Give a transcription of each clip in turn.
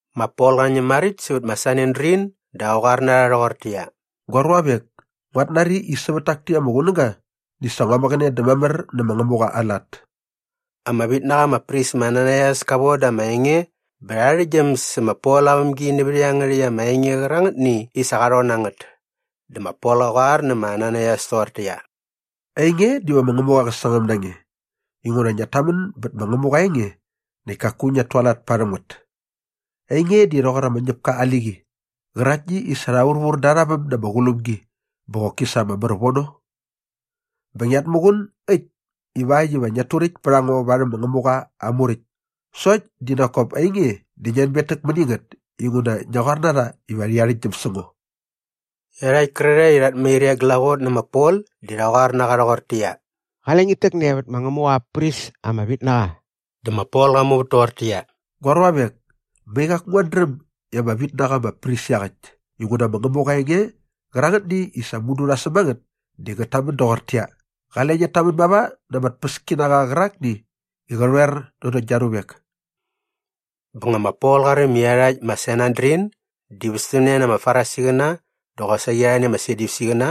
Ma Pol qa ñäm maräkt sävät ma Sanedrin dä qa qoar na rha rhoqortäqyia, “Gua ruavek, nguat nari i sävät tak täkt ama qunäga di sa ngua mäqäne dä mamär nä ma Ngämuqa aa lat.” Ama vit na qa ama pris ma Ananaias ka voda ama enge bä rha arhäktgyäm sä ma Pol aa vämgi nävät iangärhäkt ama enge qärangätni i sa qa rhon na ngät. Dä ma Pol qa qoar nä ma Ananaias toqortäqyia, “Ainge diva ma Ngämuqa qä sangäm na nge inguna ngiat tamän bät ma Ngämuqa aa enge näkt kaku ngiat tualat parhäm ngät. Ainge di rhoqor ama ñäpka aa liqi qäraktni i sa rha vurvur da arha väm na ama qulumgi bä qoki sa ama mär vono. Bä ngiat muqun äkt ivakt iva ngiat turäkt pät a ngo varhäm ma Ngämuqa aa Muräkt sokt di nak kop ainge di ngi anbetäk mäni ngät inguna ngia qoar na rha bä rha arhäktgyäm sä ngo.” Iarhakt kärarhae i rhat mair e glaqot nä ma Pol di rha qoar na qa rhoqortäqyia, “Qale ngit täkne vät ma Ngämuqa aa pris ama vit na qa!” Dä ma Pol qa muvät toqortäqyia, “Gua ruavek, mai qaku nguat dräm i ama vit na qa ama pris iaqäkt inguna ma Ngämuqa aa enge qärangätni i sa mudu rha säm a ngät di ngät tamän doqortäqyia, ‘Qale ngiat tamän mava na ama tpäskinaqa qärakni i qä rhoer nanokt gia ruvek.’” Bä nga ma Pol qa räm i iarhakt ma Sanedrin di västämne na ama Farisiqäna dä qosaqi arhani ama Sadyusiqäna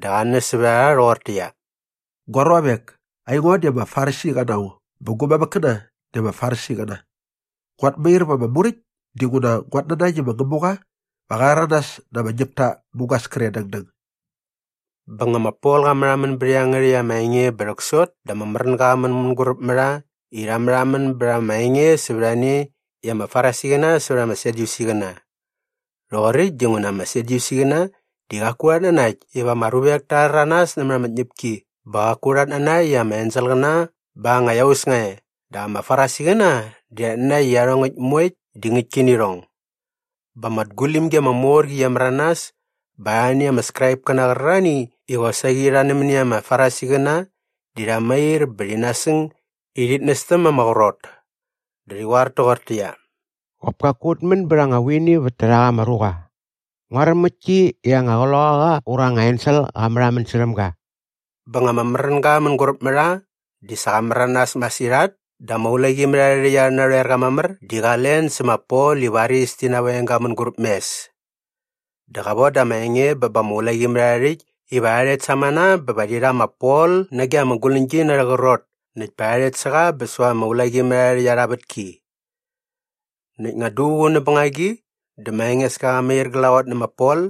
dä qa näs sävät a rha rhoqortäqyia, “Gua ruavek, aingo di ama Farisiqa na ngo bä gu mamäkkäna di ama Farisiqäna. Nguat mair va ama muräkt dinguna nguat nanakt i ma Ngämuqa va qa rhäranas na ama ñäpta mugas kre dängdäng.” Bä nga ma Pol qa märhamän bät iangärhäkt ama enge bä rhäksot dä ama märänga qa män mänguräp mä rha i rha märhamän bät ama enge sävät a ne i ama Farisiqäna sävät ama Sadyusiqäna. Rhoqoräkt dinguna ama Sadyusiqäna di qaku rhat nanakt iva ama ruvek ta rhäranas nämät ama tñäpki bä qaku rhat nanakt i ama enselqäna bä anga iaus nga e dap ama Farisiqäna di rhat nanakt i iarhongäkt moekt di ngäktki nä irhong. Bä ama tgulimgi ama mor qi qia märanas bä arhani ama Skraipkäna qärarhani i qosaqi rha nämäni ama Farisiqäna di rha mair bä rhi nasäng i rhit nästäm ma ama qrot. Dä rhi qoar toqortäqyia, “Qop kaku ut män bät anga vuini vät tärhak ama ruqa. Nguaräm ngäktki i anga qloqaqa ura anga ensel qa märhamän särhäm ga.” Bä nga ama märänga mänguräp mä rha di sa qa märanas masirhat dä ama ulaqimärharhärhäkt arhä narhoerqa mamär di qa len sä ma Pol i varis ti naveng ga mänguräp mes. Dä qa voda ama enge bä ba ama ulaqimärharhärhäkt iva rha rhet samana bä va rhi rha ma Pol nage ama guläñgi na arhä qrot näkt pa rha rhet sä qa bä säva ama ulaqimärharhärhäkt arha vätki. Näkt nga duququ näp bängagi dä ma Engeska qa mair glaqot nä ma Pol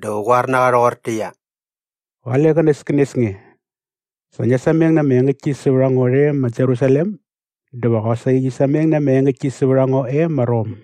dä qä qoar toqortäqyia, “Qale qänäskänes nge. Sa ngia sameng na ama engäktki sävät a ngo rhe ma Jerusalem dä va qosaqi ngi sameng na ama engäktki sävät a ngo e ma Rom.”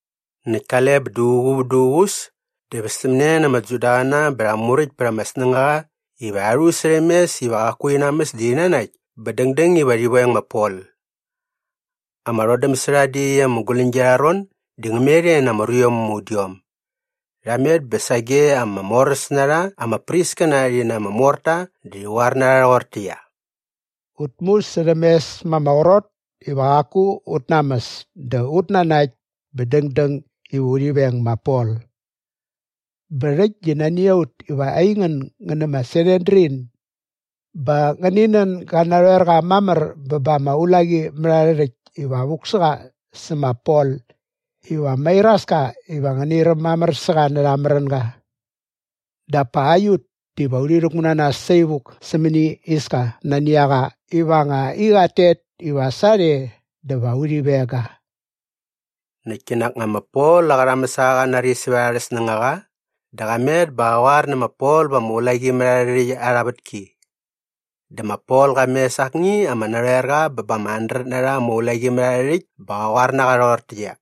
Näkt kale bä duququ vät duququs dä västämne na ama Judaqäna bä rha muräkt pät ama snängaqa i rha musärhämes iva qaku rhi namäs dä rhi nanakt bä dängdäng iva rhi veng ma Pol. Ama rhodäm sä rha dä iaqyäkt ama guläñgi arha ron di ngä met e na ama ruiom ama udiom. Rha met bä sage ama moräs na rha ama priskäna rhi na ama morta dä rhi qoar na rha rhoqortäqyia, “Ut musärhämes ma ama qrot iva qaku ut namäs dä ut nanakt bä dängdäng iva urhi veng ma Pol. Bä rhäkt di nani a ut iva aingän ngän nä ma Sanedrin ba ngäni nän gä narhoerqa mamär bä ba ama ulaqimärharhärhäkt iva vuk sä qa sä ma Pol iva mairaska iva ngäni räm mamär sä qa närha aa märänga. Dap pa aiut diva urhi rhäkmu na nas saivuk sämäni iska nani a qa iva nga i qat tet iva sarhe dä va urhi veng ga.” Näkt kinak nga ma Pol aa qärhamäsaqa qa nari sävät arhä snängaqa dä qa met bä qa qoar nä ma Pol va ama ulaqimärharhärhäkt arha vätki. Dä ma Pol qa mes akni ama narhoerqa bä ba ama handret na rha ama ulaqimärharhärhäkt bä qa qoar na qa rhoqortäqyia,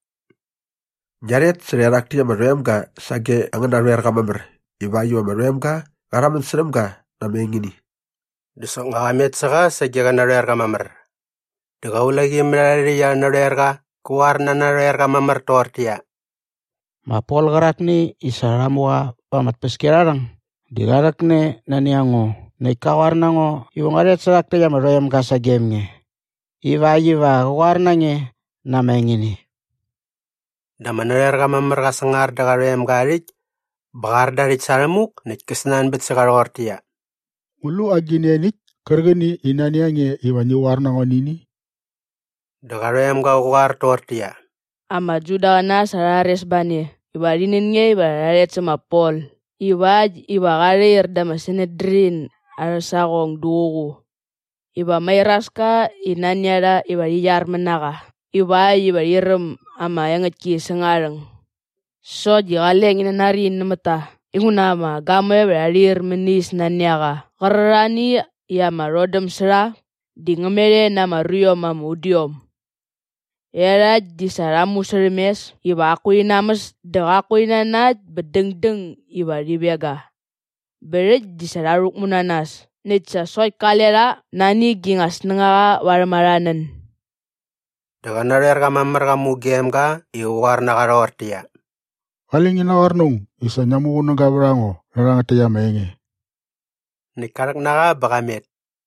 “Ngia rhet sä rhaerhak täkt ama rhoemga sage angän narhoerqa mamär ivakt iva ama rhoemga qa rhamän särhäm ga na ama engini.” Dä soknga qa met sä qa sage qä narhoerqa mamär. Dä qä ama ulaqimärharhärhäkt arhä narhoerqa kä qoar na aa narhoerqa mamär toqortäqyia, “Ma Pol qärakni i sa rha mu qa va ama tpäskiarharhäng di qa rhäkne nani a ngo näkt ka qoar na ngo iva ngua rhet sä rhak täkt ama rhoemga sagem nge ivakt iva qä qoar na nge na ama engini.” Dä ama narhoerqa mamär qa sangar dä qa rhoemga aa rhäkt bä qa ar da aa rhäkt sa rhämuk näkt kä snanbät sä qa rhoqortäqyia, “Ngu lu agi engini ianiäkt kärqäni i nani a nge iva ngi qoar na ngo nä ini?” Dä qa rhoemga qä qoar toqortäqyia, “Ama Judaqäna sa rha rhares ba ne iva rhi nän nge iva ngia rhet sä ma Pol ivakt iva qa rhair dä ma Sanedrin arhä saqong duququ iva mairaska i nani a rha iva rhi qyarmät na qa ivakt iva rhi räm ama engäktki säng aa rhäng. Sokt di qale ngi nanari nämät ta inguna ama gamoe va rha rhair mäni is nani a qa qärarhani i ama rhodäm sä rha di ngä met e na ama ruiom ama udiom. Iarhakt di sa rha musärhämes iva qaku rhi namäs dä qaku rhi nanakt bä dängdäng iva rhi veng ga. Bä rhäkt di sa rha rhäkmu na nas näkt sa sokt kale rha nani gi nga snängaqa varhäm arha nän.” Dä qä narhoerqa mamär qa mugem ga i qä qoar na qa rhoqortäqyia, “Qale ngi naqoar na aung i sa ngia muqunäga vät a ngo nä rhangät täkt ama enge.” Näkt ka rhäk na qa bä qa met.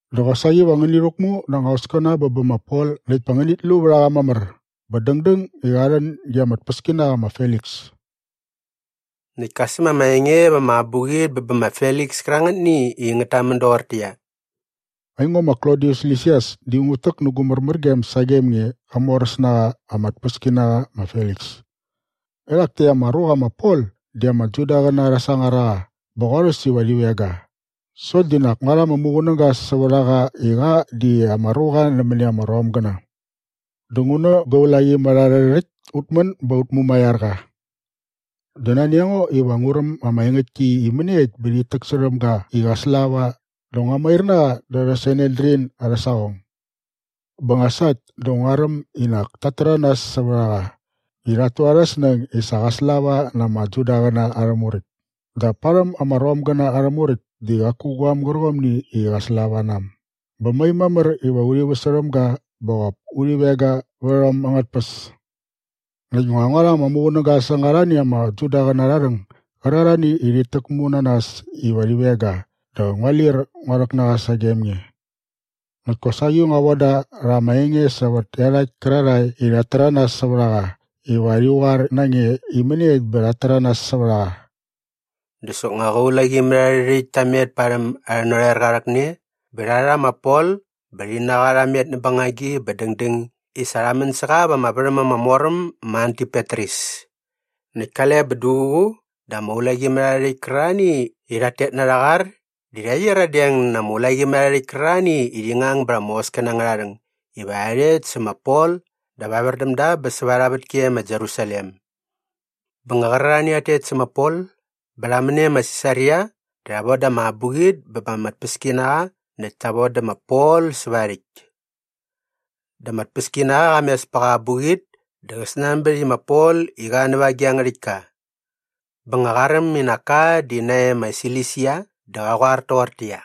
Dä qosaqi va ngäni rhäkmu na anga hoskäna bä bä ma Pol näkt pa ngänit lu vät a qa mamär bä dängdäng i qa rhän ge ama tpäskinaqa ma Feliks.” Näkt ka säm ama enge va ama abuqit bä bä ma Feliks kärangätni i ngät tamän doqortäqyia, “Aingo ma Klodius Lisias di ngut täk nä gu märmärgem sagem nge, qamoräs na qa ama tpäskinaqa ma Feliks. “Erhak täkt ama ruqa ma Pol di ama Judaqäna rha sangar a qa bä qorhäs iva rhi veng ga sokt di nak ngua rha ama muqunäga sävät a qa i qa di ama ruqa nämäni ama Romgäna dä ngu nä gua ulaqimärharhärhäkt ut män bä ut mumaiar qa. “Dä nani a ngo iva ngu räm ama engäktki i mäniekt bä rhit täksärhäm ga i qa slava dä ngua mair na qa da arhä Sanedrin arhä saqong. Bä nga sa äkt dä ngua räm i nak tat täranas sävät a qa i rhat tu arhä snäng i sa qa slava na ama Judaqäna arhä Muräkt dap parhäm ama Romgäna arhä muräkt di qaku guaäm gärqomni i qa slava na äm bä mai mamär iva urhi väsärhäm ga bä qop urhi veng ga vät a äm angät tpäs. “Näkt nga ngua rha ama muqunäga säng arhani ama Judaqäna arha rhäng gärarhani i rhit täkmu na nas iva rhi veng ga dä ngua lir ngua rhäk na qa sagem nge. Näkt kosaqi ngua von da rha ama enge sävät iarhakt kärarhae i rhat täranas sävät a qa iva rhi qoar na nge i mäniekt bä rhat täranas sävät a qa.” Dä soknga qä ulaqimärharhärhäkt ta met parhäm arhä narhoerqa aa rhäkne bä rha rha ma Pol bä rhi na qa rha met näp bängagi bä dängdäng i sa rha män sä qa va ama värhäm ama mor äm ma Antipatris. Näkt kale bä duququ dä ama ulaqimärharhärhäkt kärarhani i rhat tet na arha qar di rha qyiradeng na ama ulaqimärharhärhäkt kärarhani i rhi ngang bät ama hoskäna angärha rhäng iva rha rhet sä ma Pol dap evär däm da bä säva arha vätki e ma Jerusalem. Bä nga qärarhani i rhat tet sä ma Pol bä rha män e ma Sisaria dä rha voda ama abuqit bä ba ama tpäskinaqa näkt ta vodä ma Pol säva aa rhäkt. Dä ama tpäskinaqa qa mes pä qa abuqit dä qa snanbät i ma Pol i qa näva agi a ngärhäktka. Bä nga qa räm i nak ka di nae ma Silisia dä qa qoar toqortäqyia,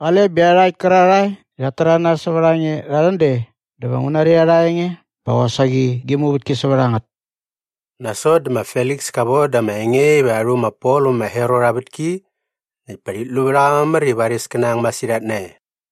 “Qale bä iarhakt kärarhae i rhat täranas sävät a nge rha rhän de dä va ngu nari arha enge bä qosaqi gi muvätki sävät a ngät.” Nasot dä ma Feliks ka voda ama enge iva rha rhu ma Pol vä ma Herot aa vätki näkt pa rhit lu vät a qa mamär i varis kä nang masirhat nae.